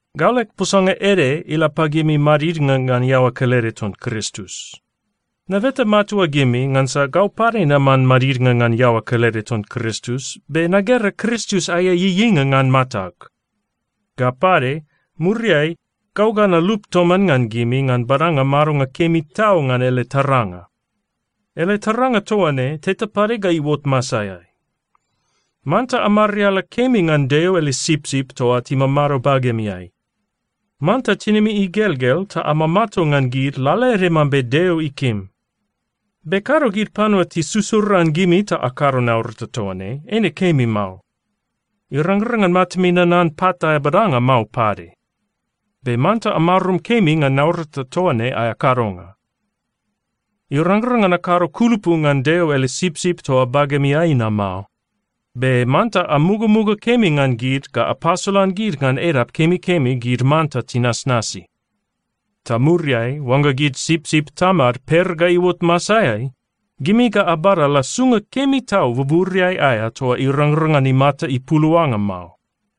Gau leg posanga ede ila pagimi madidnga ngan iaoa kelede ton Kristus. Nabeta matua gimi ngansa gau pade naman madidnga ngan iaoa kelede ton Kristus, be nagera Kristus aea ieieinga ngan matag. Ga pade, muriai gau ga nalup toman ngan gimi ngan badanga madonga kemi tau ngan ele taranga. Ele taranga toa ne, teta pade ga iuot masaeai. Manta amariala kemi ngan Deo ele sipsip toa timamado bagemiai. Manta tinimi igelgel ta amamato ngan gid lalaede mambe Deo ikim. Be kado gid panua tisusuran gimi ta akado naurata toa ne. Eine kemi mao. Irangrang ngan matami nanan pat aea badanga mao pade. Be manta amarum kemi ngan naurata toa ne aea kadonga. Irangrang ngan akado kulupu ngan Deo ele sipsip toa bagemiai na mao. Be manta amugamuga kemi ngan gid ga apasolan gid ngan edap kemikemi gid manta tinasnasi. Ta muriai oangga gid sipsip Tamad per ga iuot masaeai, gimi ga abada lasunga kemi tau buburiai aea toa irangrang ngan imata ipuluanga mao.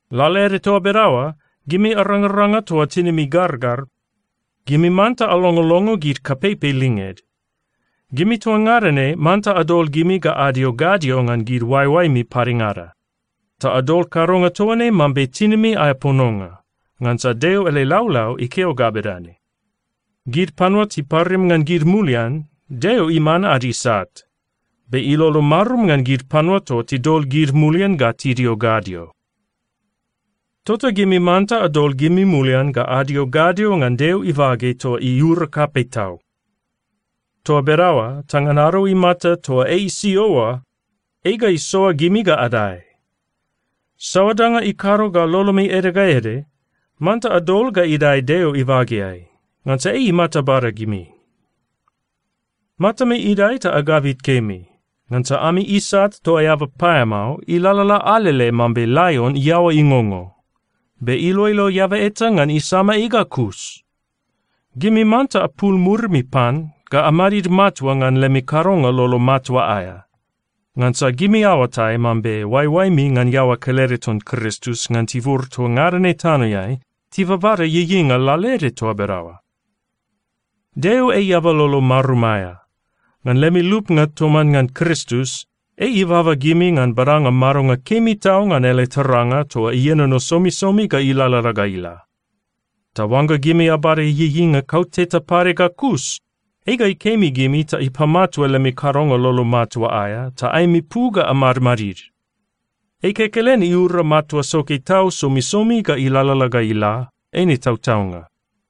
Lalaede toa bedaoa, gimi arangaranga toa tinimi gargar, gimi manta alongolongo gid kapeipei linged. Gimi toa ngada ne manta adol gimi ga adio gadio ngan oaeoaemi padengada, ta adol kadonga toa ne mambe tinimi aea pononga. Ngansa Deo ele laulau ikeo ga bedane, “Gid panua tiparim ngan gid mulian, Deo iman ad isat. Be ilolo marum ngan gid panua toa tidol gid mulian ga tidio gadio.” Tota gimi manta adol gimi mulian ga adio gadio ngan Deo ibage toa iura kapei tau. Toa bedaoa ta ngan ado imata toa ei isio oa, ei ga isoa gimi ga adae. Saoa danga ikado ga lolomi ede ga ede, manta adol ga idae Deo ibageai, ngansa ei imata bada gimi. Matami idae ta agabit kemi. Ngansa ami isat toa eaba paeamao ilalala alele mambe laion iaoa ingongo, be iloilo eaba eta ngan isama ei ga kus. Gimi manta apul murimi pan ga amadid matua ngan lemi kadonga lolo matua aea. Ngansa gimi aoatai mambe oaeoaemi ngan iaoa kelede ton Kristus ngan tibur toa ngada ne tanoeai tibabada ieieinga lalaede toa bedaoa. Deo ei eaba lolo marum aea. Ngan lemi lupnga toman ngan Kristus, ei ibaba gimi ngan badanga madonga kemi tau ngan ele taranga toa ienono somisomi ga ilalala ga ila. Ta oangga gimi abada ieieinga kauteta pade ga kus, ei ga ikemi gimi ta ipamatua lemi kadonga lolo matua aea, ta aemi pu ga amadmadid. Ei kekelen iura matua soke tau somisomi ga ilalala ga ila. Eine tautaunga.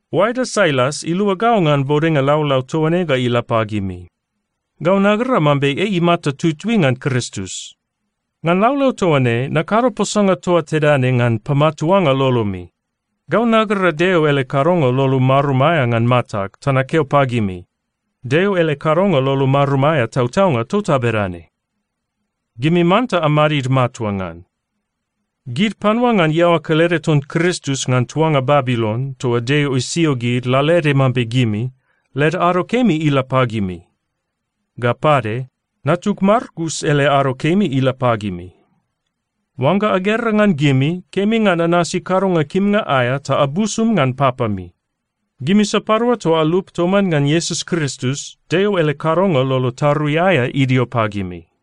Oaeda Sailas ilua gau ngan bodenga laulau toa ne ga ila pagimi. Gau nagera mambe ei imata tutui ngan Kristus. Ngan laulau toa ne, nakado posanga toa tedane ngan pamatuanga lolomi. Gau nagera Deo ele kadonga lolo marum aea ngan matag ta nakeo pagimi: Deo ele kadonga lolo marum aea tautaunga tota bedane. Gimi manta amadid matua ngan. Gid panua ngan iaoa kelede ton Kristus ngan tuanga Babilon toa Deo isio gid lalaede mambe gimi, led ado kemi ila pagimi. Ga pade, natug Markus ele ado kemi ila pagimi. Oangga agera ngan gimi, kemi ngan anasi kadonga kimnga aea ta abusum ngan papami. Gimi sapadua toa alup toman ngan Iesus Kristus, Deo ele kadonga lolo tarui aea idio pagimi.